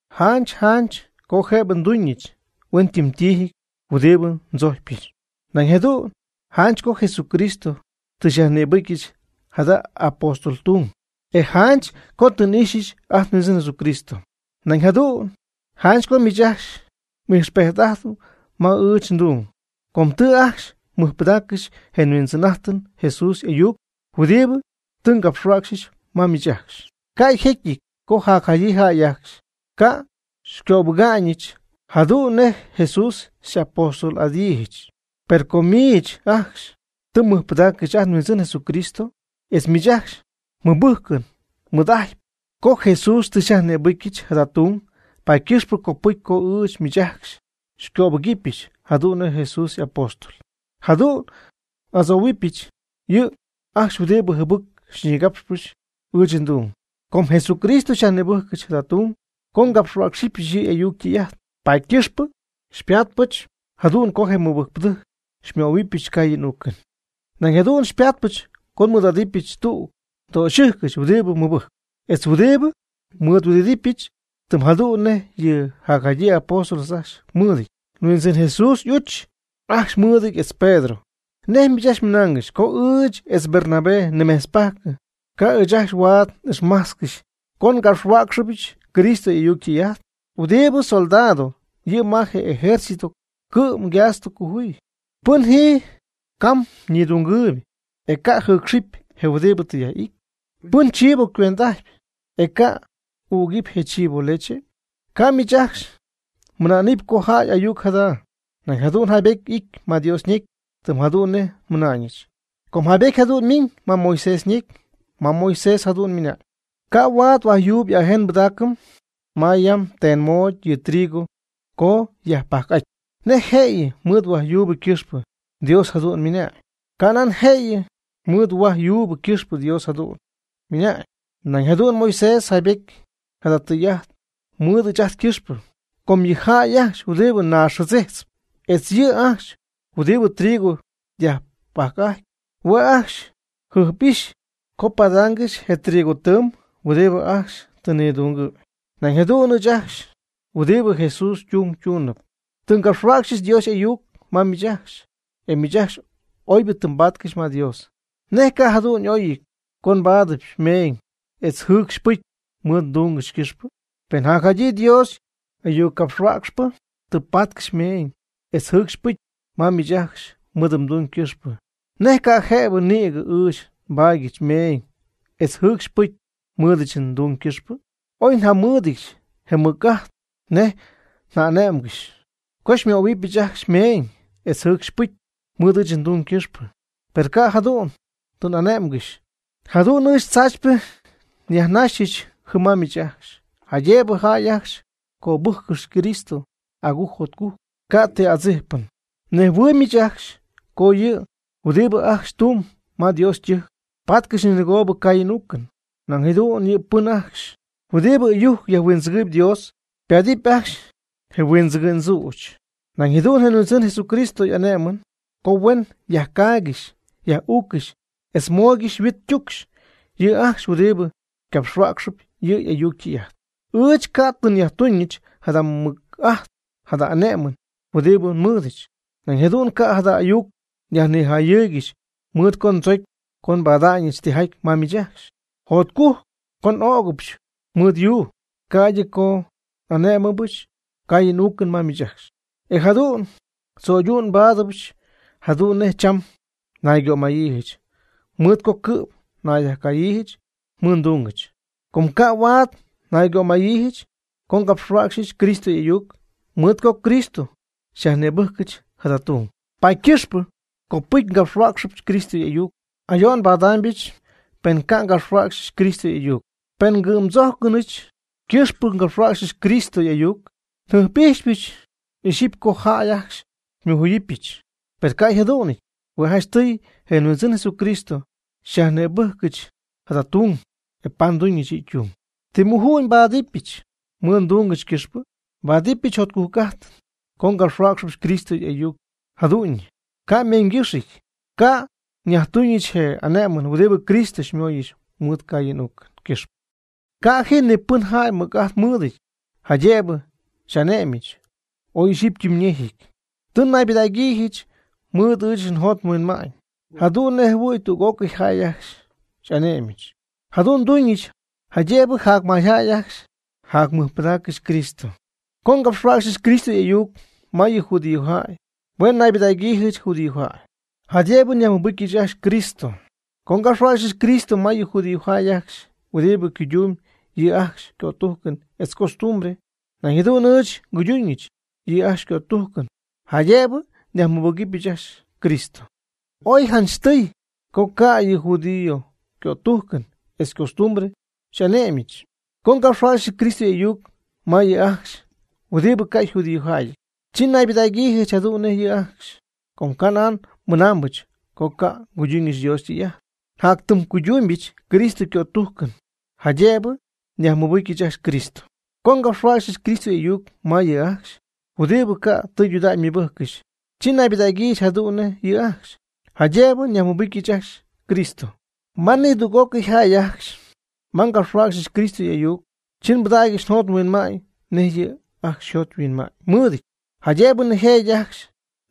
Janch janch co jëbɨ nduñɨch huentiijɨty huɨdibɨ ndzojcpɨch. Nañ jadu'n janch co Jesucristo tɨ xyajnïbɨcyɨch jada apóstol tung. Etz janch co tɨ n'ixyɨch ajt nHuindzɨn Jesucristo. Nañ jadu'n janch co miich ajcxy ijxpejt'ajtp ma ɨɨch ndung, com tɨ ajcxy mmɨjpɨdaaccɨxy je nHuindzɨn'ajtɨm Jesús y'ayuc huɨdibɨ tɨ ngapxhuäcxyɨch ma miich ajcxy. Ca' jécyɨty co jacjadyii jäy ajcxy ca' xycöbɨga'ñɨch jadu'n nej Jesús xy'apóstol'adyiijɨch. Per com miich ajcxy tɨ mmɨjpɨdaaccɨxy ajt nHuindzɨn Jesucristo, etz miich ajcxy mmɨbɨjcɨn nidɨy'ajtp co Jesús tɨ xyyajnïbɨcyɨch jada tung, paady ycɨxpɨ copɨcy co ɨɨch miich ajcxy xycöbɨgɨpyɨch jadu'n nej Jesús y'apóstol. Jadu'n n'adzohuimbityɨch yɨ' ajcxy huɨdibɨ jɨbɨc xyñigapxɨp ɨɨch ndung. Com Jesucristo xyajnïbɨjcɨch jada tung co ngapxhuäcxyɨch yɨ' y'ayuc ytɨy'ajt, paady ycɨxpɨ xypatpɨch jadu'n co je mɨbɨjcpɨdɨjc xymöhuɨbɨch ngaayɨn n'uucɨn. Nañ jadu'n xypaatpɨch co nmɨɨd'adɨpyɨch tüg ndöxyɨjcɨch huɨdibɨ mɨbɨjcp, etz huɨdibɨ nmɨɨdhuɨdɨdɨpyɨch tɨm jadu'n nej yɨ jacjadyii apóstol ajcxy mɨɨdɨty, etz je Huindzɨn Jesús y'uch ajcxy mɨɨdɨty, etz Pedro. ¿Nej miich ajcxy mmɨnaangɨxy co ɨɨch etz Bernabé nimejtzpajc ca' ɨɨch ajcxy huaad ixmajtzcɨxy yɨ ndungɨch co ngapxhuäcxyɨch Cristo y'ayuc ytɨy'ajt? ¿Huɨdibɨ soldado yɨ' ma je ejercito cɨ'm ygasto cojuy? ¿Pɨn ji cam nidungɨɨyb, e ca' jɨɨcxɨpy je huɨdibɨ tɨ yaj'ity? Pɨn ychibo cuend'ajtp, ¿e ca' ügɨpy je chibo yleche? Ca' miich ajcxy mɨna'nɨpy co jäy y'ayuc jada. Nañ jadu'n jaybety y'ity ma Dios ñecy tɨm jadu'n nej nmɨna'ñɨch. Com jaybety jadu'n ymiñ ma Moisés ñecy, ma Moisés jadu'n ymɨna'ñ: “Ca' huaad huajyuub y'ajen mbɨdaacɨ ma yam ten moody yɨ trigo co yajpajc'aty.” ¿Nej jëyɨ mɨɨd huajyuub ycɨxpɨ Dios jadu'n ymɨna'ñ? Canan jëyɨ mɨɨd huaj yuub ycɨxpɨ Dios jadu'n ymɨna'ñ. Nañ jadu'n Moisés jaybejty jada tɨy'ajt mɨɨd ɨɨch ajt ycɨxpɨ. Com yɨ jäy ajcxy huɨdibɨ naaxjɨdzijtzp, etz yɨ' ajcxy huɨdibɨ trigo yajpajc'ajtp, hue' ajcxy yjɨjp'ijxyp co padaangɨxy je moc tɨɨm huɨdibɨ ajcxy tɨ nidungɨ̈y. Nañ jadu'n ɨɨch ajcxy huɨdibɨ Jesús ytung tuunɨp, tɨ ngapxhuäcxyɨch Dios y'ayuc ma miich ajcxy, e miich ajcxy oybɨ tɨ mbaatcɨxy ma Dios. ¿Nej ca' jadu'n y'oyɨty co nbaadyɨch meeñ etz jɨcxy pɨcy mɨɨd ndungɨch ycɨxpɨ? Pen jacjadyii Dios y'ayuccapxhuäcxpɨ tɨ paatcɨxy meeñ etz jɨcxy pɨcy ma miich ajcxy mɨɨd ytung ycɨxpɨ, ¿nej ca' jëbɨ nïgɨ ɨɨch nbaadyɨch meeñ etz jɨcxy pɨcy mɨɨdɨch ndung ycɨxpɨ? Oy njamɨ́ɨdɨdyɨch je mɨc'ajt nej nja'ane'mgɨxy co xymöhuɨbyɨch ajcxy meeñ etz jɨcxy pɨcy mɨɨd ɨɨch ndung ycɨxpɨ, per ca' jadu'n tɨ n'ane'mgɨxy. Jadu'n ɨɨch tzaachypɨ nyajnajxɨch jɨm ma miich ajcxy, jaydëbɨ jäy ajcxy cöbɨjccɨxy Cristo agujc jotcujc ca' ti adzijpɨn. Mnejhuɨɨyb miich ajcxy co yɨ' huɨdibɨ ajcxy tumb ma Dios ytɨjc, paatcɨxy ninɨgoobɨ caayɨn uucɨn. Nañ jadu'n yɨ' pɨn ajcxy huɨdibɨ ɨyujc yajhuindzɨgɨɨyb Dios, paatɨp ajcxy je huindzɨgɨ'ñ tzüch. Nañ jadu'n je Huindzɨn Jesucristo ane'my co huen yajcaaygɨxy yaj'uuccɨxy etz mooygɨxy yhuit ytucx yɨ' ajcxy huɨdibɨ capxhuäcxcɨxp yɨ' y'ayuc ytɨy'ajt. Ɨɨch ca' tɨ nyajtuñɨch jada mɨc'ajt jada ane'mɨn huɨdi nmɨɨdɨch. Nañ jadu'n ca' jada ayuc nyajnijayɨɨygɨxy, mɨɨd co ndzocy co pada'ñɨch tijaty ma miich ajcxy. Jacjotcujc co n'ögɨbɨch mɨɨd yuu, ca'ydɨ co n'ané'mɨbɨch caayɨn uucɨn ma miich ajcxy, e jadu'n tzöydu'n nbáadɨbyɨch jadu'n nej cham naygömayiijɨch, mɨɨd co cɨ'm nnayyajcayiijɨch mɨɨd ndungɨch. Com ca' huaad naygömayiijɨch co ngapxhuäcxyɨch Cristo y'ayuc. Mɨɨd co Cristo xyyajnïbɨjcɨch jada tung, paady ycɨxpɨ copɨcy ngapxhuäcxyɨch Cristo y'ayuc. Ayo'n nbadaamybɨch, pen ca' ngapxhuäcxɨch Cristo y'ayuc. Pen ngɨ'mdzójcɨnɨch ycɨxpɨ ngapxhuäcxɨch Cristo y'ayuc, njɨjp'ijxypɨch ixyipy co jäy ajcxy xymɨjuyɨpyɨch. Per ca' yjadu'nɨty. Hue' janchtɨy je Huindzɨn Jesucristo xyajnïbɨjcɨch jada tung, e paady nduñɨch yɨ' ytung. ¿Ti muju'ñ nbáadɨbɨch mɨɨd ndungɨch ycɨxpɨ? Nbáadɨbɨch jotcujc'ajtɨn co ngapxhuäcxɨbɨch Cristo y'ayuc jadu'ñyɨ, ca' ymeeñygɨxyɨty. Ca' nyajtuñɨch je ane'mɨn huɨdibɨ Cristo xymóyɨch mɨɨd caayɨn uucɨn ycɨxpɨ. Ca' ji ni pɨn jäy mɨc'ajt mɨɨdɨty jaydëbɨ xy'ane'myiijɨch. Oy ixyipy ytɨmyñejɨty tɨ nnaybɨdägyiijɨch mɨɨd ɨɨch njot nhuinma'ñ jadu'n nej jɨhuɨ̈y tüg'ócɨy jäy ajcxy xy'ane'myɨch. Jadu'n nduñɨch jaydëbɨ jac mayjäy ajcxy nyajmɨbɨgɨpyɨch Cristo. Co ngapxhuäcxyɨch Cristo y'ayuc ma yɨ judíojäy, hue' naybɨdägyiijɨch judíojäy, jaydëbɨ nyajmɨbɨcyɨch ajcxy Cristo. Co ngapxhuäcxyɨch Cristo ma yɨ judíojäy ajcxy huɨdibɨ cuydumyb yɨ' ajcxy ycötujcɨn etz ycostumbre, nañ jadu'n ɨɨch nguyduñɨch yɨ' ajcxy ycötujcɨn, jaydëbɨ nyajmɨbɨcyɨch ajcxy Cristo. Ooy yjanchɨty co ca' yɨ judío ycötujcɨn etz ycostumbre xy'ane'myɨch. Co ngapxhuäcxyɨch Cristo y'ayuc ma yɨ' ajcxy huɨdibɨ ca' yjudíojäyɨty, chi naybɨdägyiijɨch jadu'n nej yɨ' ajcxy. Ca' nan nmɨnaambɨch co ca' nguyduñɨch Dios ytɨy'ajt. Hue' njatytɨmycuydumybɨch Cristo ycötujcɨn, jaydëbɨ nyajmɨbɨcyɨch ajcxy Cristo. Co ngapxhuäcxyɨch Cristo y'ayuc ma yɨ' ajcxy huɨdibɨ ca' tɨydudägy ymɨbɨjccɨxy, chi naybɨdägyiijɨch jadu'n nej yɨ' ajcxy, jaydëbɨ nyajmɨbɨcyɨch ajcxy Cristo. Ma nidüg'ócɨy jäy ajcxy ma ngapxhuäcxyɨch Cristo y'ayuc, chi nbɨdägyɨch njot nhuinma'ñ nej yɨ' ajcxy yjot yhuinma'ñ mɨɨdɨty, jaydëbɨ nijëjɨty ajcxy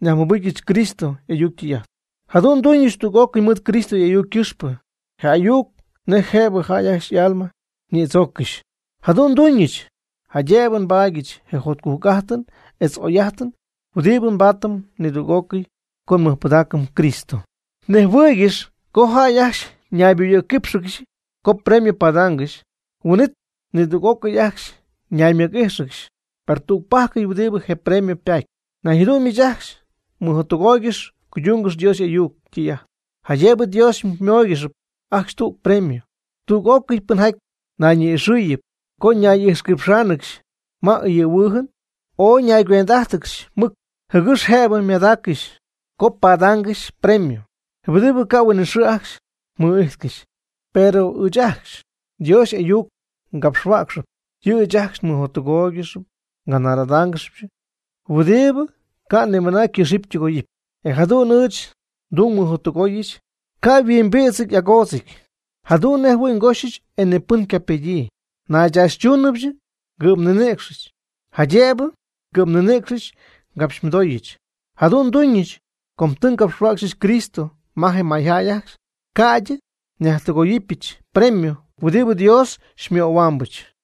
nyajmɨbɨcyɨch Cristo y'ayuc ytɨy'ajt. Jadu'n nduñɨch tüg'ócɨy mɨɨd Cristo y'ayuc ycɨxpɨ, je ayuc nej jëbɨ jäy ajcxy y'alma ñïdzooccɨxy. Jadu'n nduñɨch, jaydëbɨ nbaadyɨch je jotcujc'ajtɨn etz oy'ajtɨn huɨdibɨ nbaatɨm nidüg'ócɨy co nmɨjpɨdaacɨm Cristo. Mnejhuɨɨygɨxy co jäy ajcxy ñayboyɨ̈cquípxɨgɨxy co premio padaangɨxy, huin'it nidüg'ócɨy ajcxy ñaymɨc'íjxɨgɨxy, per tügpajc huɨdi je premio patp. Nañ jadu'n miich ajcxy mɨjottɨgooygɨx cuydungɨx Dios y'ayuc ytɨy'ajt, jaydëbɨ Dios xymóoygɨxɨpy ajcxy tüg premio. Tüg'ócɨy pɨnjaty nayñi'ixɨɨyɨp co ñay'ixquipxáanɨgɨxy ma ɨyɨ̈huɨɨjɨn, ooy ñayguend'ájtɨgɨxy mɨc, jɨgɨx jëbɨ ymadaaccɨxy co ganar'adaangɨxy premio huɨdibɨ ca' huinɨxɨɨ ajcxy mɨ'ijtcɨxy. Pero ɨɨch ajcxy Dios y'ayuc capxhuäcxy, yɨ' ɨɨch ajcxy mɨjottɨgooygɨxy nganar'adáangɨxyɨch huɨdibɨ ca' nimɨna ycɨxɨpy ytɨgoyɨpy. E jadu'n ɨɨch ndung mɨjottɨgooyɨch, ca' yhuimbïdzɨty agoodzɨty, jadu'n nejɨhuɨ̈y ngoxɨch e nipɨn ca ypegyii. Nnaychaachytumybɨch ngɨ'mninïcxɨch, jaydëbɨ ngɨ'mninïcx xycapxymɨdooyɨch. Jadu'n nduñɨch co tɨ ngapxhuäcxyɨch Cristo ma je mayjäy ajcxy, ca'ydɨ nyajtɨgoyɨpyɨch nbremio huɨdibɨ Dios xymöhuambɨch.